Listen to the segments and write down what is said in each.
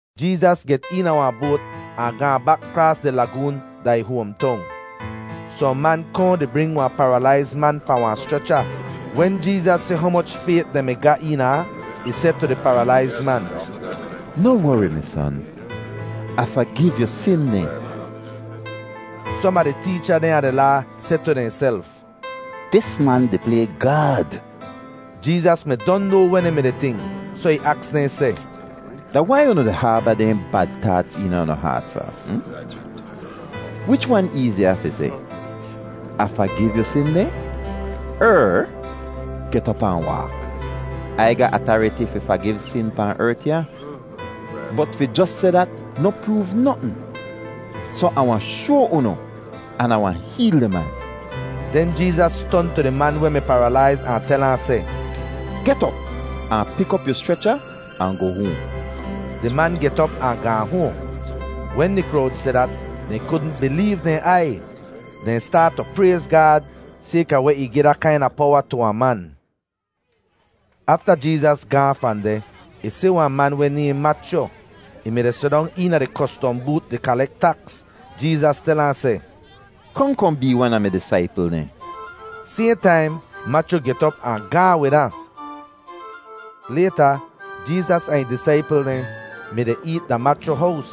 Jeezas get eena wahn boat ahn gaahn bak kraas di lagoon da ih hoamtong. Sohn man kohn di bring wahn paralaiz man pahn wahn schrecha. Wen Jeezas si humoch fayt dehn mi ga eena ahn, ih seh tu di paralaiz man, “Noh wori, mi son. Ah fagiv yu sin dehn.” Som a di teecha dehn a di Laa seh tu dehnself, “Dis man di play Gaad.” Jeezas mi don noa weh dehn mi-di tink soh ih aks dehn seh, “Da wai unu di haaba dehn bad taats eena unu haat fa? Wich wan eeziya fi seh, ‘Ah fagiv yu sin dehn,’ er ‘Get op ahn waak?’ Ai ga atariti fi fagiv sin pahn ert ya. Bot fi jos seh dat noh proov notn, soh Ah wahn shoa unu an Ah wahn heel di man.” Den Jeezas ton tu di man weh mi paralaiz ahn tel ahn seh, “Get op ahn pik op yu schrecha ahn goh hoahn.” Di man get op ahn gaahn hoahn. Wen di krowd si dat, dehn kudn bileev dehn aiy. Dehn staat tu prayz Gaad sayka weh ih gi da kaina powa tu wahn man. Afta Jeezas gaahn fahn deh, ih si wahn man weh nayhn Machyu. Ih mi-di sidong eena di kostom boot di kalek taks. Jeezas tel ahn seh, “Kohn kohn bee wan a mi disaipl dehn.” Sayhn taim Machyu get op ahn gaahn wid ahn. Layta Jeezas ahn ih disaipl dehn mi-di eet da Machyu hows,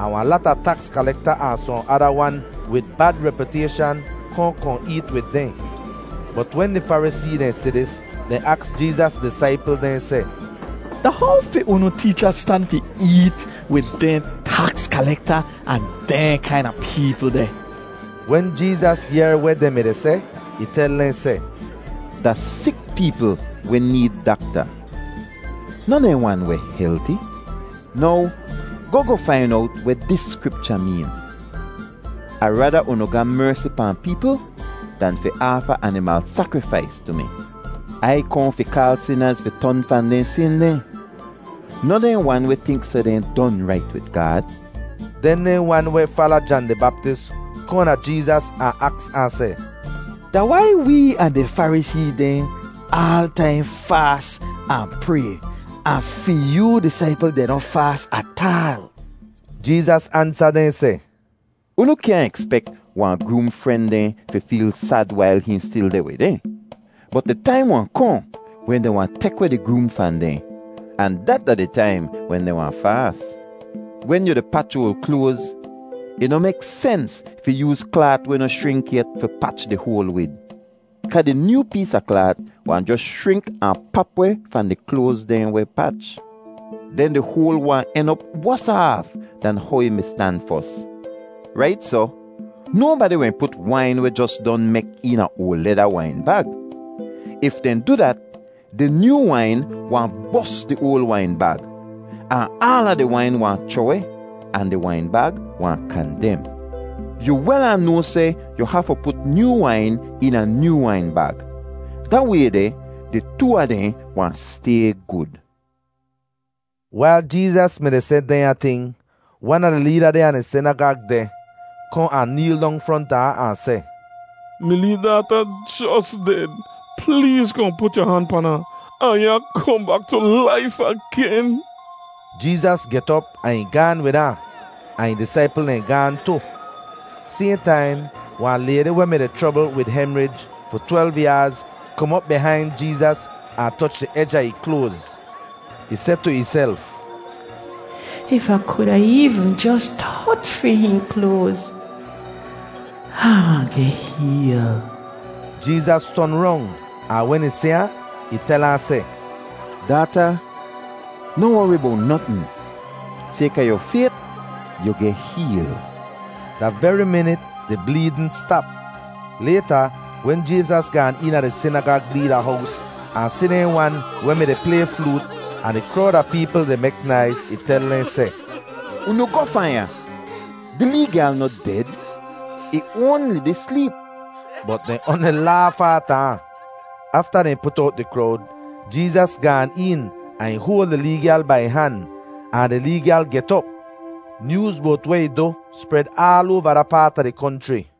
ahn wahn lata taks kalekta ahn sohn ada wan wid bad repyutayshan kohn kohn eet wid dehn. Bot wen di Farisee dehn si dis, dehn aks Jeezas disaipl dehn seh, “Da how fi unu teecha stan fi eet wid dehn taks kalekta ahn dehn kaina peepl deh?” Wen Jeezas yehr weh dehn mi-di seh, ih tel dehn seh, “Da sik peepl weh need dakta, noh dehn wan weh helti. Now goh goh fain owt weh dis Skripcha meen: ‘Ah raada unu ga mersi pahn peepl, dan fi aafa animal sakrifais tu mi.’ Ai kohn fi kaal sinaz fi ton fahn dehn sin dehn, noh dehn wan weh tink seh dehn don rait wid Gaad.” Den dehn wan weh fala Jan di Baptis kohn da Jeezas ahn aks ahn seh, “Da wai wee ahn di Farisee dehn aal taim faas ahn pray ahn fi yoo disaipl dehn noh faas ataal?” Jeezas ansa dehn seh, “Unu kyaahn ekspek wahn groom fren dehn fi feel sad wail hihn stil deh wid dehn. Bot di taim wahn kohn wen dehn wahn tek weh di groom fahn dehn, ahn dat da wen dehn wahn faas. “Wen yu di pach oal kloaz, ih noh mek sens fi yooz klaat weh noh schrink yet fi pach di hoal wid, kaa di nyoo pees a klaat wahn jos schrink ahn pap weh fahn di kloaz dehn weh pach. Den di hoal wahn en op wosa aaf dan how ih mi stan fos. Rait soh, nobadi wahn put wain weh jos don mek eena oal leda wain bag. If dehn du dat, di nyoo wain wahn bos di oal wain bag, ahn aala di wain wahn chroh-weh ahn di wain bag wahn kandem. Yu wel ahn noa seh yu hafu put nyoo wain eena nyoo wain bag. Da way deh di too a dehn wahn stay gud.” Wail Jeezas mi-di seh dehnya ting, wan a di leeda dehn a di sinagag deh kohn ahn neel dong fronta ahn, ahn seh, “Mi lee daata jos ded. Pleez kohn put yu han pan ahn, ahn ih wahn kohn bak tu laif agen.” Jeezas get op ahn ih gaahn wid ahn, ahn ih disaipl dehn gaahn tu. Sayhn taim wahn laydi weh mi-di chrobl wid hemrij fi twelv yaaz kom op bihain Jeezas ahn toch di ej a ih kloaz. Ih seh tu ihself, “If Ah kuda eevn jos toch fi hihn kloaz, Ah wahn geh heel.” Jeezas ton rong, ahn wen ih si ahn, ih tel ahn seh, “Daata, noh wori bowt notn; sayka yu fayt, yu geh heel.” Da veri minit di bleedn stap! Layta, wen Jeezas gaan eena di sinagag leeda hows ahn si dehn wan weh mi-di play floot ahn di krowd a peepl di mek naiz, ih tel dehn seh, “Unu goh fahn ya. Di lee gyal noh ded; ih oanli di sleep!” Bot dehn oanli laaf aata ahn. Afta dehn put owt di krowd, Jeezas gaan een ahn ih hoal di lee gyal bai ih han, ahn di lee gyal get op. Nyooz bowt weh ih du spred aal oava da paat a di konchri.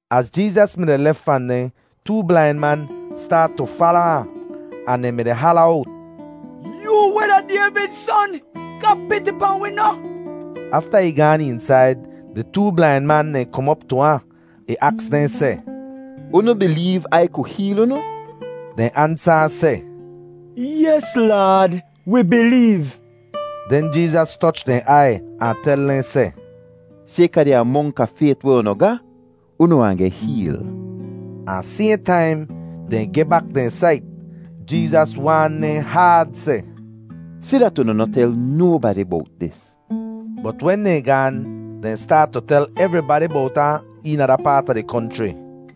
Az Jeezas mi-di lef fahn deh, too blain man staat tu fala ahn, ahn dehn mi-di hala owt, “Yoo weh da Dayvid Son, ga piti pahn wi noh!” Afta ih gaan eensaid, di too blain man dehn kom op tu ahn. Ih aks deh seh, “Unu bileev Ai ku heel unu?” Dehn ansa ahn seh, “Yes Laad, wi bileev.” Den Jeezas toch dehn aiy ahn tel dehn seh, “Sayka di amonk a fayt weh unu ga, unu wahn geh heel.” Ahn sayhn taim, dehn geh bak dehn sait. Jeezas waan dehn haad seh, “Si dat unu noh tel nobadi bowt dis.” Bot wen dehn gaan, dehn staat tu tel evribadi bowt ahn eena da paat a di konchri.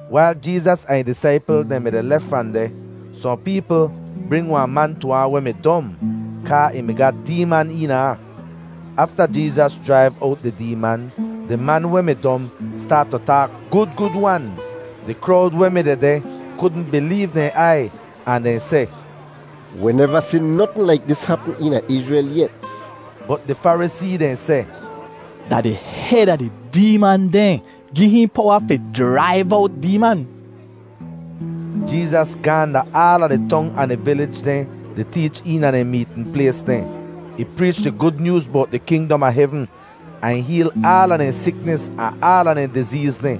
Wail Jeezas ahn ih disaipl dehn mi-di lef fahn deh, sohn peepl bring wahn man tu ahn weh mi dom, kaa ih mi ga deeman eena ahn. Afta Jeezas jraiv owt di deeman, di man weh mi dom staat tu taak gud gud-wan. Di krowd weh mi dehdeh kudn bileev dehn aiy ahn dehn seh, “Wi neva si notn laik dis hapm eena Izrel yet.” Bot di Farisee dehn seh, “Da di hed a di deeman dehn gi hihn powa fi jraiv owt deeman.” Jeezas gaahn da aala di tong ahn di vilij dehn di teech eena dehn meetn plays dehn. Ih preech di Gud Nyooz bowt di kingdom a hevn, ahn ih heel aala dehn siknis ahn aala dehn dizeez dehn.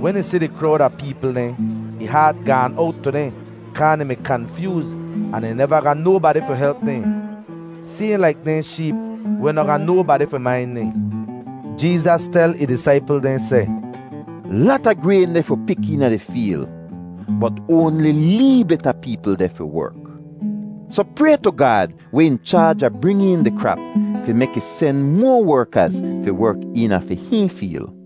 Wen ih si di krowd a peepl dehn, ih haat gaan owt tu dehn kaa dehn mi kanfyooz ahn dehn neva ga nobadi fi help dehn, sayhn laik dehn sheep weh noh ga nobadi fi main dehn. Jeezas tel ih disaipl dehn seh, “Lata grayn deh fi pik eena di feel, bot oanli lee bit a peepl deh fi werk. Soh pray tu Gaad weh in chaaj a bring een di krap fi mek ih sen moa werkaz fi werk eena fi hihn feel.”